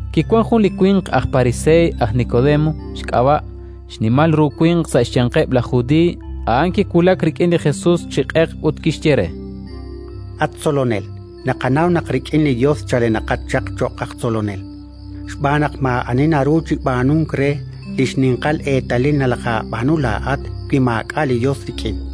Kiwank jun li winq aj Pariseey, aj Nikodemo xk'ab'a', xnimal ru winq sa' xyanqeb' laj Judiiy. A'an kiwulak rik'in li Jesus chi q'eq ut kixye re: —At Tzolonel, naqanaw naq rik'in li Yos chalenaqat chaq cho'q aj tzolonel, xb'aan naq maa'ani naru chi b'aanunk re li xninqal eetalil nalajaab'aanu laa'at wi maak'a' li Yos rik'in.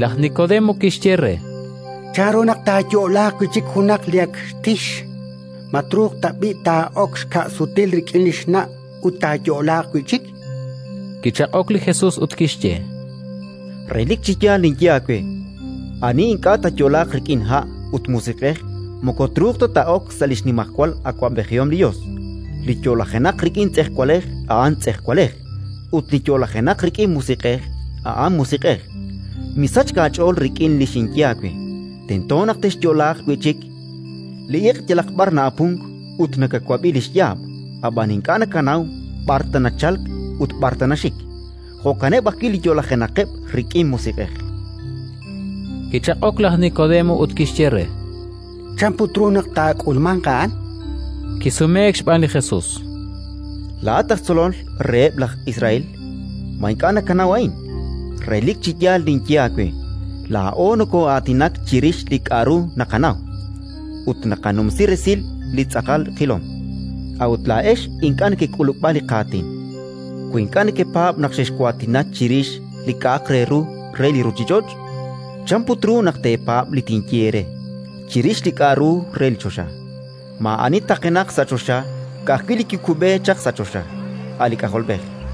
Laj Nikodemo kixye re: —Chanru naq taayo'laaq wi' chik junaq li ak xtixk? Ma truuq tab'i' taa'ok xka' sutil rik'in li xna' ut taayo'laaq wi' chik? Kichaq'ok li Jesus ut kixye: —Relik chi yaal ninye aawe: ani ink'a' taayo'laaq rik'in ha' ut Musiq'ej moko truuq ta taa'ok sa' li xnimajwal awab'ejihom li Yos. Li yo'lajenaq rik'in tz'ejwalej a'an tz'ejwalej, ut li yo'lajenaq rik'in li Musiq'ej a'an musiq'ej. Misachk aach'ool rik'in li xinye aawe: «Tento naq texyo'laaq wi' chik». Li iq' yalaq b'ar na'apunk ut nakawab'i li xyaab', ab'an ink'a' nakanaw b'ar ta nachalk ut b'ar ta naxik. Jo'kaneb' ajwi' li yo'lajenaqeb' rik'in Musiq'ej. Kichaq'ok laj Nikodemo ut kixye re: —Chan put ru naq taak'ulmanq a'an? Kisumeek xb'aan li Jesus: —Laa'at aj tzolol reheb' laj Israel: ma ink'a' nakanaw a'in? Relik chi yaal ninye aawe: laa'o nokoo'aatinak chirix li k'aru naqanaw, ut naqanumsi resil li tz'aqal qilom; a'ut laa'ex ink'a' nekek'ulub'a li qaatin. Wi ink'a' nekepaab' naq xexwaatina chirix li k'aru re li ruuchich'och', chan put ru naq teepaab' li tinye eere chirix li k'aru re li choxa? “Maa'ani taqenaq sa' choxa, ka'ajwi' li kikub'e chaq sa' choxa, a' li K'ajolb'ej.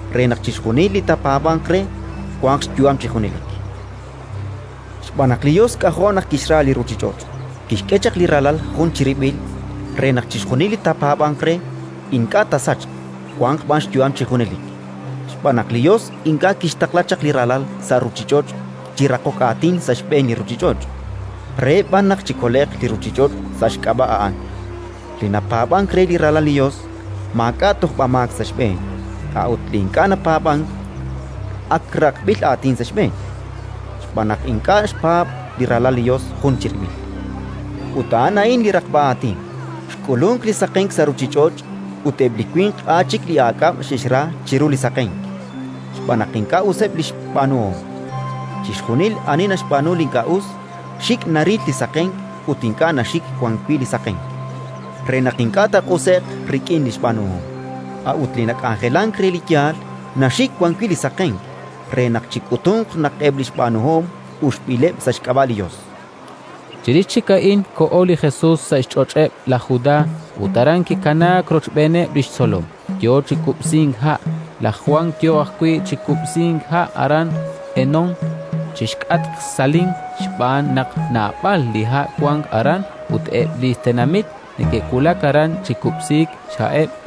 re naq chixjunil li taapaab'anq re wanq xyu'am chi junelik. “Xb'aan naq li Yos k'ajo' naq kixra li ruuchich'och': kixk'e chaq li Ralal jun chirib'il re naq chixjunil li taapaab'anq re, ink'a' taasachq, wanq b'an xyu'am chi junelik. Xb'aan naq li Yos ink'a' kixtaqla chaq li Ralal sa' ruuchich'och' chi raqok aatin sa' xb'een li ruuchich'och', re b'an naq chikole'q li ruuchich'och' sa' xk'ab'a' a'an. “Li napaab'ank re li Ralal li Yos, maak'a' tojb'amaak sa' xb'een. A'ut li ink'a' napaab'ank, ak raqb'il aatin sa' xb'een, xb'aan naq ink'a' xpaab' li Ralal li Yos jun chirib'il. Ut a'an a'in li raqb'a aatin: xk'ulunk li saqenk sa' ruuchich'och' ut eb' li winq a' chik li aak'ab' xe'xra chiru li saqenk, xb'aan naq ink'a' useb' li xb'aanuhom. Chixjunil ani naxb'aanu li ink'a' us, xik' naril li saqenk ut ink'a' naxik wan wi' li saqenk, re naq ink'a' taaq'use'q rik'in li xb'aanuhom. A'ut li nak'anjelank re li yaal, naxik wan wi' li saqenk, re naq chik'utunq naq eb' li xb'aanuhom uxb'ileb' sa' xk'ab'a' li Yos”. Chirix chik a'in koho li Jesus sa' xch'och'eb' laj Judá, ut aran kikanaak rochb'eeneb' li xtzolom, yo chi kub'sink ha'. Laj Jwan yo ajwi' chi kub'sink ha' aran Enón, chi xk'atq Salim, xb'aan naq naab'al li ha' wank aran ut eb' li tenamit neke'wulak aran chi kub'siik xha'eb'.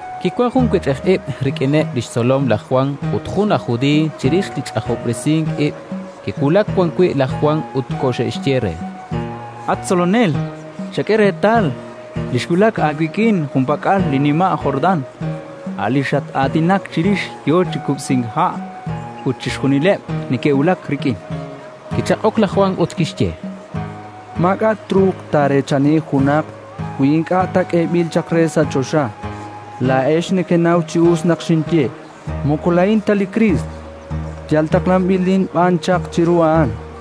Kiwank jun wech'ij ib' rik'ineb' li xtzolom laj Jwan ut jun aj judiiy, chirix li ch'ajob'resink ib'. Ke'wulak wan wi' laj Jwan ut koxe'xye re: —At Tzolonel, chak'e reetal: li kiwulak aawik'in junpak'al li nima' Jordán, a' li xat-aatinak chirix, yo chi kub'sink ha' ut chixjunileb' neke'wulak rik'in. Kichaq'ok laj Jwan ut kixye: —Maak'a' truuq taareechani junaq, wi ink'a' ta k'eeb'il chaq re sa' choxa. Laa'ex nekenaw chi us naq xinye: «Moko laa'in ta li Kriist, yal taqlanb'ilin b'an chaq chiru a'an».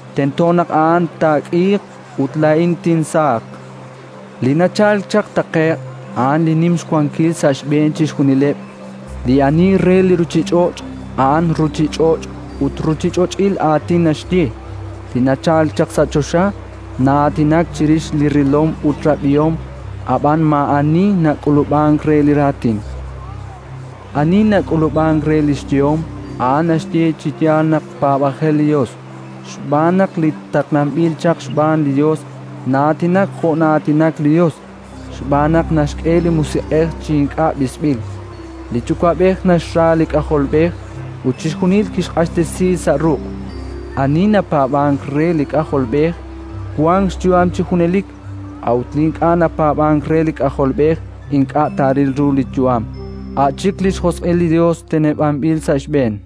Tento naq A'an taak'iiq ut laa'in tinsaaq. “Li nachalk chaq taqe'q a'an li nim xwankil sa' xb'een chixjunileb'. Li ani re li ruuchich'och', a'an ruuchich'och' ut ruuchich'och'il aatin naxye. Li nachalk chaq sa' choxa na'aatinak chirix li rilom ut rab'ihom, ab'an maa'ani nak'ulub'ank re li raatin. Ani nak'ulub'ank re li xyehom, a'an naxye chi yaal naq paab'ajel li Yos. Xb'aan naq li taqlanb'il chaq xb'aan li Yos na'aatinak jo' na'aatinak li Yos, xb'aan naq naxk'e li Musiq'ej chi ink'a' b'isb'il. Li Yuwa'b'ej naxra li K'ajolb'ej ut chixjunil kixq'axtesi sa' ruq'. Ani napaab'ank re li K'ajolb'ej, wank xyu'am chi junelik; a'ut li ink'a' napaab'ank re li K'ajolb'ej ink'a' taaril li yu'am, a' chik li xjosq'il li Yos teneb'anb'il sa' xb'een”.